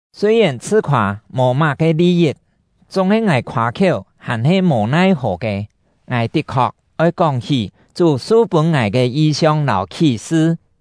Sûi-yèn chhṳ-khoâ mò má-ke li-yit, chúng-he ngài khoâ-khiéu hàn-he mò-nai-hò ke; ngài tit-khok oi kóng-hí Chú su-pûn ngài ke yi-siong lâu khí-sṳ.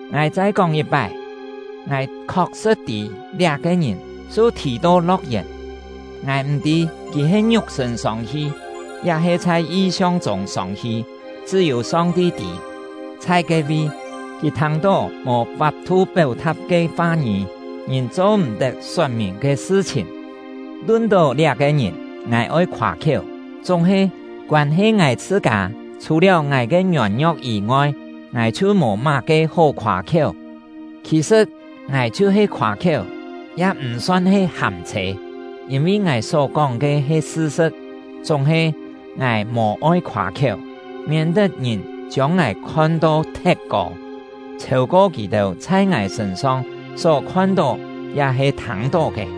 Ngài chai kóng yit-pái, ngài khok-sṳ̍t tî liá-ke ngìn su-thì to lo̍k-yèn (ngài m̀-tî kì he ngiuk-sṳ̂n sông-hi, ya-he chhai yi-siong chûng sông-hi, chṳ́-yû Song-ti tî). Chhai ke-vi, kì thâng-tó mò fap-thu péu-tha̍t ke fa-ngî, ngìn cho-m̀-tet sot-mìn ke sṳ-chhìn. Lun-tó liá-ke ngìn, ngài oi khoâ-khiéu; chúng-he, koân-he ngài chhṳ-kâ, chhù-liáu ngài ke ngiôn-ngio̍k yî-ngoi, ngài chhiu mò má-ke hó khoâ-khiéu. Khì-sṳ̍t, ngài chhiu-he khoâ-khiéu, ya m̀ son he hâm-chhê, yîn-vi ngài só-kóng ke he sṳ-sṳ̍t. Chúng-he, ngài mò-oi khoâ-khiéu, miên-tet ngìn chiông ngài khon to thet kô, chhêu-ko kì chhai ngài sṳ̂n-song só khon-tó ya-he thâng-tó ke.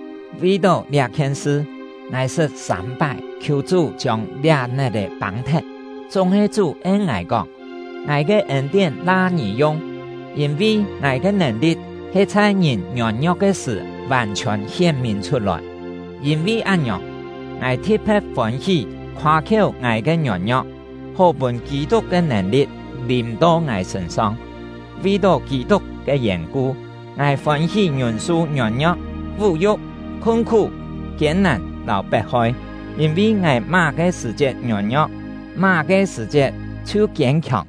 Vi-tó liá-khien sṳ, ngài sṳt sâm-pái khiù Chú chiông liá net-è pâng-thet, chúng-he Chú en ngài kóng: “Ngài ke ên-tién la ngì yung; yîn-vi Ngài ke nèn-li̍t he chhai ngìn ngiôn-ngio̍k ke sṳ̀ vàn-chhiòn hién-mìn chhut-lòi.” Yîn-vi án-ngiòng, ngài thi̍t-phe̍t fôn-hí khoâ-khiéu ngài ke ngiôn-ngio̍k, hó pûn Kî-tuk ke nèn-li̍t lìm-to ngài sṳ̂n-song. Vi-tó Kî-tuk ke yèn-ku, ngài fôn-hí ngiûn-su ngiôn-ngio̍k, vú-yu̍k, khun-khú, kiên-nàn lâu pet-hoi; yîn-vi ngài má-ke sṳ̀-chiet ngiôn-ngio̍k, má-ke sṳ̀-chiet chhiu kiên-khiòng.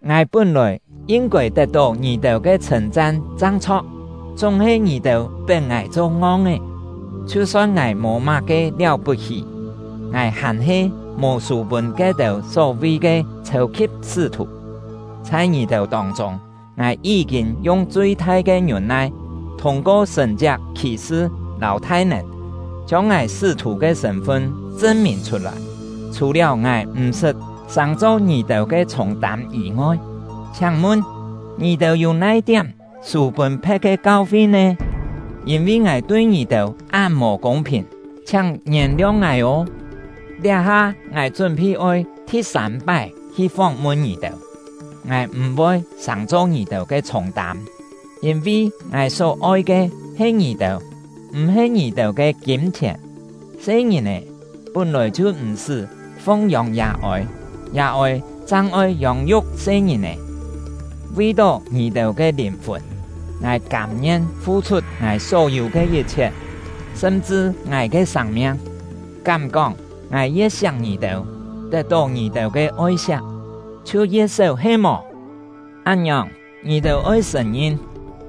Ngài pún-lòi yin-kôi tet-tó ngì-têu ke chhṳ̂n-chan chang chho̍k, chúng-he ngì-têu pet ngài cho ngong-é. Chhiu-son ngài mò má-ke liáu-put-hí, ngài hàn-he mò sû pûn ke-têu só-vi ke “chhêu-khi̍p sṳ́-thù”. Chhai ngì-têu tông-chûng, ngài yí-kîn yung chui-thai ke ngiûn-nai, thûng-ko sṳ̀n-chiak khì-sṳ lâu thai-nèn, chiông ngài sṳ́-thù ke sṳ̂n-fun chṳn-mìn chhut-lòi. Chhù-liáu ngài m̀-sṳt sàng-cho ngì-têu ke chhûng-tâm yî-ngoi, chhiáng-mun, ngì-têu yû nai-tiám sû pûn phe̍t ke kau-fi nè? Yîn-vi ngài tui ngì-têu án mò kûng-phìn, chhiáng ngièn-liong ngài ô! Liá-ha ngài chún-phi oi thi-sâm-pái hi fóng-mun ngì-têu. Ngài m̀-voi sàng-cho ngì-têu ke chhûng-tâm; yîn-vi ngài só-oi ke he ngì-têu, m̀-he ngì-têu ke kîm-chhièn. Se-ngìn-è pún-lòi chhiu m̀-sṳ́ fung-yông yà-ôi, yà-ôi chang oi yông-yuk se-ngìn-è. Vi-tó ngì-têu ke lìn-fùn, ngài kâm-ngien fu-chhut ngài só-yû ke yit-chhiet, sṳm-chṳ ngài ke sâng-miang. Kám-kóng ngài ye̍t siak ngì-têu, tet-tó ngì-têu ke oi-siak chhiu ye̍t séu he-mò? Án-ngiòng, ngì-têu oi sṳ̀n-ngin,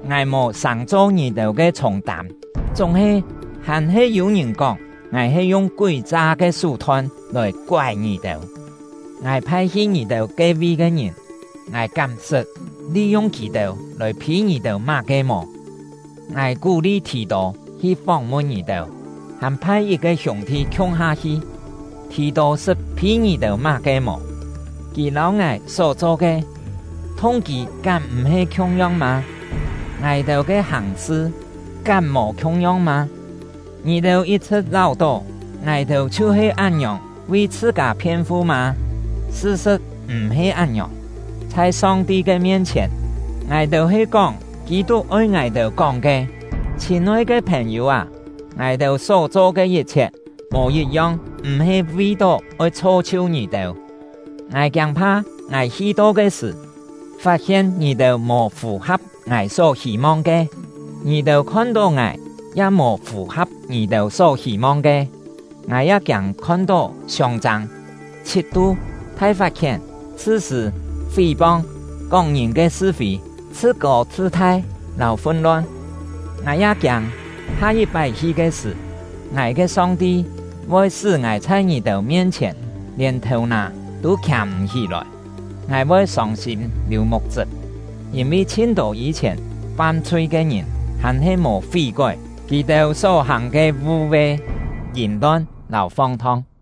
ngài mò sàng-cho ngì-têu ke chhûng-tâm; chúng-he, hàn-he yû-ngìn kóng ngài he yung kúi-cha ke sú-thon lòi koái ngì-têu. Ngài phai hi ngì-têu ke-vi ke ngìn, ngài kám sṳt li-yung kì-têu lòi phî ngì-têu má-ke mò? Ngài kú-li Thì-tô hi fóng-mun ngì-têu, hàn phai yit-ke hiûng-thi khiung-ha hi. Thì-tô sṳt phî ngì-têu má-ke mò? Kì lâu ngài só-cho ke, thung-kî kám m̀-he khiung-yong mâ? Ngài-têu ke hàng-sṳ kám mò khiung-yong mâ? Ngì-têu yit-chhṳ̍t láu-tó ngài-têu chhiu-he án-ngiòng vi chhṳ-kâ phien-fu mâ? Sṳ-sṳ̍t m̀-he án-ngiòng! Chhai Song-ti ke mien-chhièn, ngài-têu he kóng Kî-tuk oi ngài-têu kóng ke. Chhîn-oi ke phèn-yû â, ngài-têu só-cho ke yit-chhiet mò yit-yong m̀-he vi-tó oi chho-chhiu ngì-têu! Ngài kiâng-pha ngài hi-to ke sṳ̀, fat-hien ngì-têu mò fù-ha̍p ngài só hî-mong ke, ngì-têu khon-tó ngài ya mò fù-ha̍p ngì-têu só hî-mong ke. Ngài ya kiâng khon-tó siông-châng, chhit-tu, thai fat-khién, chhṳ-sṳ̂, fí-pong, kóng ngìn ke sṳ-fî, chhṳ-kô chhṳ-thai, lâu fun-lon. Ngài ya kiâng, ha-yit-pái hi ke sṳ̀, ngài ke Song-ti voi sṳ́ ngài chhai ngì-têu mien-chhièn lièn thèu-nà tû khià-m̀-hí-lòi; ngài voi sông-sîm liù muk-chṳp, yîn-vi chhin-tô yî-chhièn fam-chhui ke ngìn hàn-he mò fí-kói kì-têu só-hàng ke vû-ve, yìm-lon lâu fong-thong.